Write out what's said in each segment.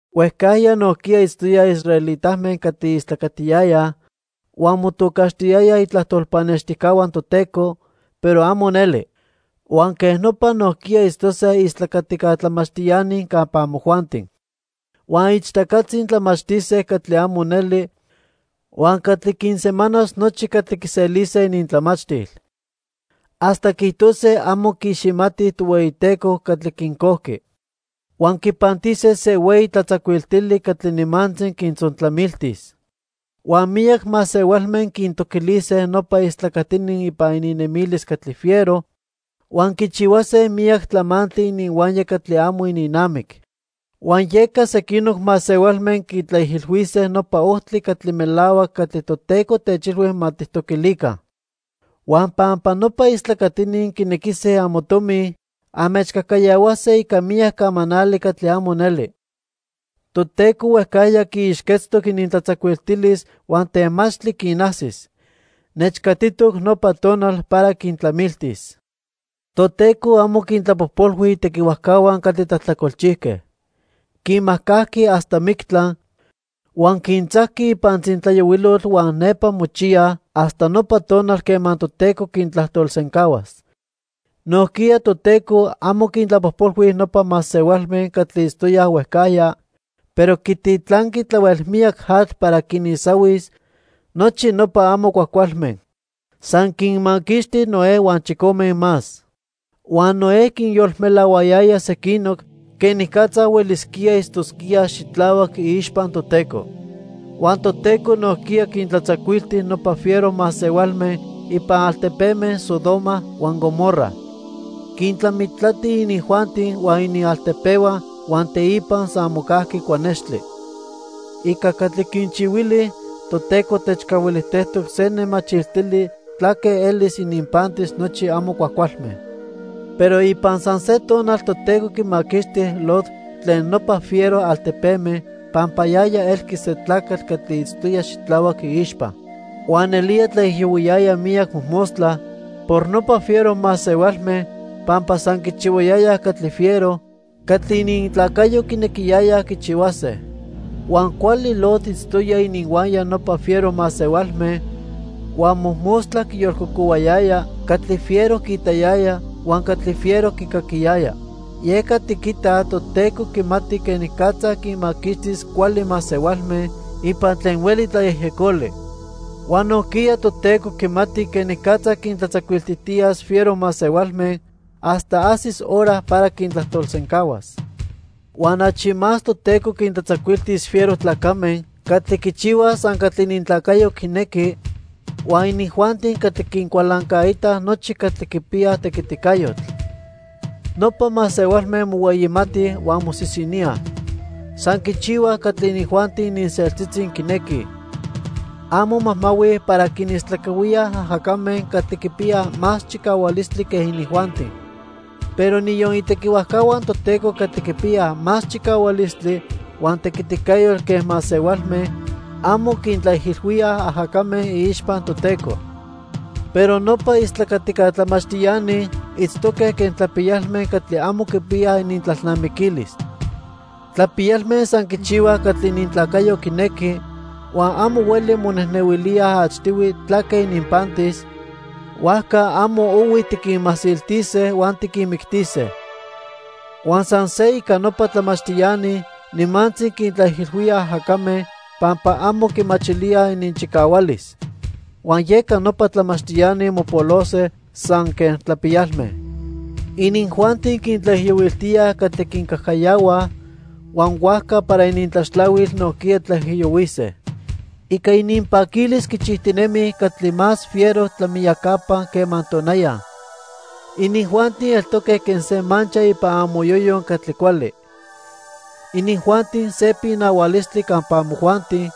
Huejcajya nojquiya itztoyaj israelitame catli istlacatiyayaj huan motocaxtiyayaj itlajtol pannextijcahua Toteco, pero amo neli. Huan quej nopa nojquiya itztose istlacatica tlamachtiani campa amojuanti. Huan ichtacatzi tlamachtise catli amo neli huan catli quinsemanas nochi catli quiselise inintlamachtil. Hasta quiijtose amo quiiximatij Tohueyiteco catli quincojqui. Huan quipantise se hueyi tlatzacuiltili catli nimantzi quintzontlamiltis. Huan miyac masehualme quintoquilise nopa istlacatini ipan ininnemilis catli fiero huan quichihuase miyac tlamantli ininhuaya catli amo ininnamic. Huan yeca sequinoc masehualme quitlaijilhuise nopa ojtli catli melahuac catli Toteco techilhui ma tijtoquilica. Huan pampa nopa istlacatini quinequise amotomi, anmechcajcayahuase ica miyac camanali catli amo neli. Toteco huejcajya quiixquetztoc inintlatzacuiltilis huan temachtli quinajsis. Nechcatitoc nopa tonal para quintlamiltis. Toteco amo quintlapojpolhui itequihuajcahua catli tlajtlacolchijque. Quinmajcajqui hasta mictla, huan quintzajqui ipan tzintlayohuilotl huan nepa mochiyaj hasta nopa tonal quema Toteco quintlajtolsencahuas. Nojquiya Toteco amo quintlapojpolhui nopa masehualme catli itztoyaj huejcajya, pero quititlanqui tlahuel miyac atl para quinisahuis nochi nopa amo cuajcualme. San quinmaquixti Noé huan chicome más. Huan Noé quinyolmelahuayaya sequinoc quenicatza huelisquíaj itztosquíaj xitlahuac iixpa Toteco. Huan Toteco nojquiya quintlatzacuilti nopa fiero masehualme ipan altepeme Sodoma huan Gomorra. Quintlamitlati inijuanti huan inialtepehua huan teipa san mocajqui cuanextli. Ica catli quinchihuili, Toteco techcahuilijtejtoc se nemachiltili tlaque elis ininpantis nochi amo cuajcualme. Pero ipan san se tonal Toteco quimaquixti Lot tlen nopa fiero altepeme pampa yaya elqui se tlacatl catli itztoya xitlahuac iixpa. Huan nelía tlaijiyohuiyaya miyac mojmostla por nopa fiero masehualme pampa san quichihuayayaj catli fiero catli inintlacayo quinequiyayaj quichihuase. Huan cuali Lot itztoya ininhuaya nopa fiero masehualme, huan mojmostla quiyolcocohuayaya catli fiero quiitayaya huan catli fiero quicaquiyaya. Yeca tiquitaj Toteco quimati quenicatza quinmaquixtis cuali masehualme ipan tlen hueli tlayejyecoli. Huan nojquiya Toteco quimati quenicatza quintlatzacuiltijtiyas fiero masehualme hasta ajsis hora para quintlajtolsencahuas. Huan achi más Toteco quintlatzacuiltis fiero tlacame catli quichihuaj san catli inintlacayo quinequi huan inijuanti catli quincualancaitaj nochi catli quipiyaj tequiticayotl. Nopa masehualme mohueyimatij huan mosisiníaj. San quichihuaj catli inijuanti ininseltzitzi quinequij. Amo majmahuij para quinistlacahuíaj ajacame catli quipiyaj más chicahualistli quen inijuanti. Pero niyon itequihuajcahua Toteco catli quipiyaj más chicahualistli huan tequiticayotl que masehualme, amo quintlaijilhuíaj ajacame iixpa Toteco. Pero nopa istlacatica tlamachtiani itztoque quen tlapiyalme catli amo quipiyaj inintlalnamiquilis. Tlapiyalme san quichihuaj catli inintlacayo quinequi, huan amo hueli monejnehuilíaj achtihui tlaque ininpantis, huajca amo ohui tiquinmasiltise huan tiquinmictise. Huan san se ica nopa tlamachtiani, nimantzi quintlaijilhuíaj ajacame pampa amo quimachilíaj ininchicahualis. Huan yeca nopa tlamachtiani mopolose san quen tlapiyalme. Inijuanti quintlaijiyohuiltíaj catli quincajcayahuaj, huan huajca para inintlaxtlahuil nojquiya tlaijiyohuise. Ica ininpaquilis quichijtinemij catli más fiero tlamiyacapa quema tonaya. Inijuanti eltoque quen se mancha ipan amoyoyo catli cuali. Inijuanti se pinahualistli campa amojuanti,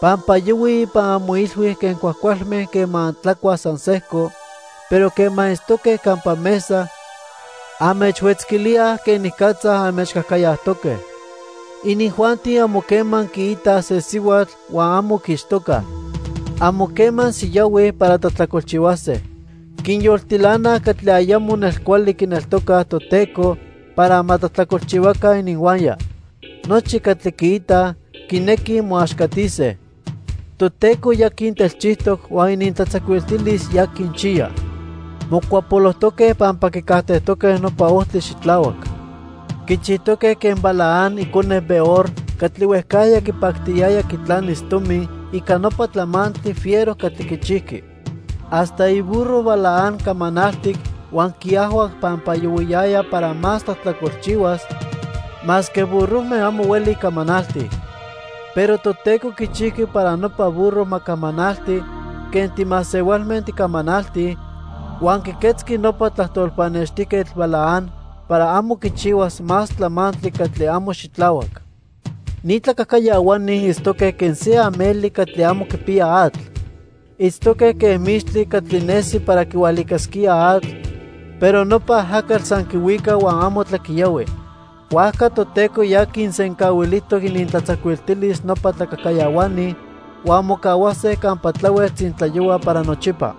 pampa yohuij ipan amoilhui quen cuajcualme quema antlacuaj san sejco, pero quema itztoque campa mesa, anmechhuetzquilíaj quenicatza anmechcajcayajtoque. Inijuanti amo quema quiitaj se sihuatl huan amo quiixtocaj. Amo quema siyahuij para tlajtlacolchihuase. Quinyoltilanaj catli ayamo nelcuali quineltocaj Toteco para ma tlajtlacolchihuaca ininhuaya. Nochi catli quiitaj, quinequij moaxcatise. Toteco ya quintelchijtoc huan inintlatzacuiltilis ya quinchiya. Mocuapolojtoque pampa quicajtejtoque nopa ojtli xitlahuac. Quichijtoque quen Balaam icone Beor catli huejcajya quipactiyaya quitlanis tomi ica nopa tlamantli fiero catli quichijqui. Hasta iburro Balaam camanaltic huan quiajhuac pampa yohuiyaya para más tlajtlacolchihuas, masque burrojme amo hueli camanaltij. Pero Toteco quichijqui para nopa burro ma camanalti quen timasehualme ticamanaltij, huan quiquetzqui nopa tlajtol pannextijquetl Balaam para amo quichihuas más tlamantli catli amo xitlahuac. Ni tlacajcayahuani itztoque quen se ameli catli amo quipiya atl. Itztoque quen mixtli catli nesi para quihualicasquía atl, pero nopa ajacatl san quihuica huan amo tlaquiyahui. Huajca Toteco ya quinsencahuilijtoc inintlatzacuiltilis nopa tlacajcayahuani huan mocahuase campa tlahuel tzintlayohua para nochipa.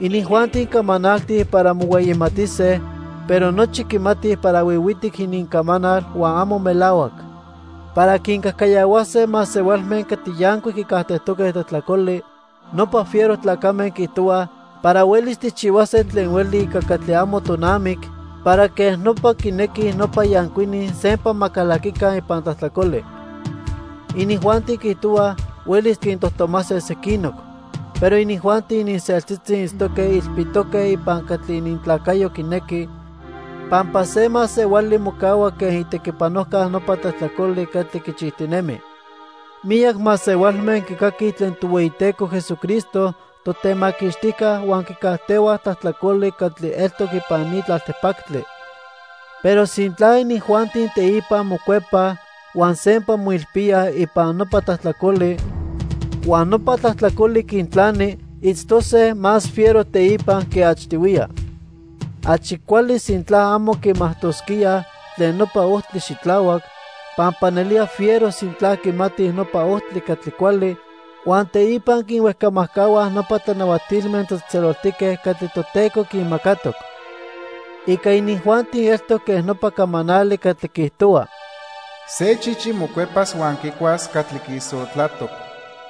Inijuanti camanaltij para mohueyimatise, pero nochi quimatij para huihuitic inincamanal huan amo melahuac. Para quincajcayahuase masehualme catli yancuic quicajtejtoque tlajtlacoli, nopa fiero tlacame quiijtohuaj para huelis tijchihuase tlen hueli ica catli amo tonamic para quej nopa quinequij nopa yancuini sempa ma calaquica ipan tlajtlacoli. Inijuanti quiijtohuaj huelis quintojtomase sequinoc, pero inijuanti ininseltzitzi itztoque ilpitoque ipan catli inintlacayo quinequi, pampa se masehuali mocahua quen itequipanojca nopa tlajtlacoli catli quichijtinemi. Miyac masehualme quicaquij tlen Tohueyiteco Jesucristo, Totemaquixtijca, huan quicajtehuaj tlajtlacoli catli eltoc ipan ni tlaltipactli. Pero sintla inijuanti teipa mocuepaj huan sempa moilpíaj ipan nopa tlajtlacoli huan nopa tlajtlacoli quintlani, itztose más fiero teipa que achtihuiya. Achi cuali sintla amo quimajtosquíaj tlen nopa ojtli xitlahuac, pampa nelía fiero sintla quimatij nopa ojtli catli cuali huan teipa quinhuejcamajcahuaj nopa tlanahuatilme tlatzejtzeloltique catli Toteco quinmacatoc. Ica inijuanti eltoc quen nopa camanali catli quiijtohua: "Se chichi mocuepas huan quicuas catli quiisotlatoc.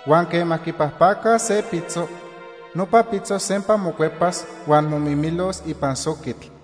Huan quema quipajpacaj se pitzo, nopa pitzo sempa mocuepas huan momimilos ipan soquitl."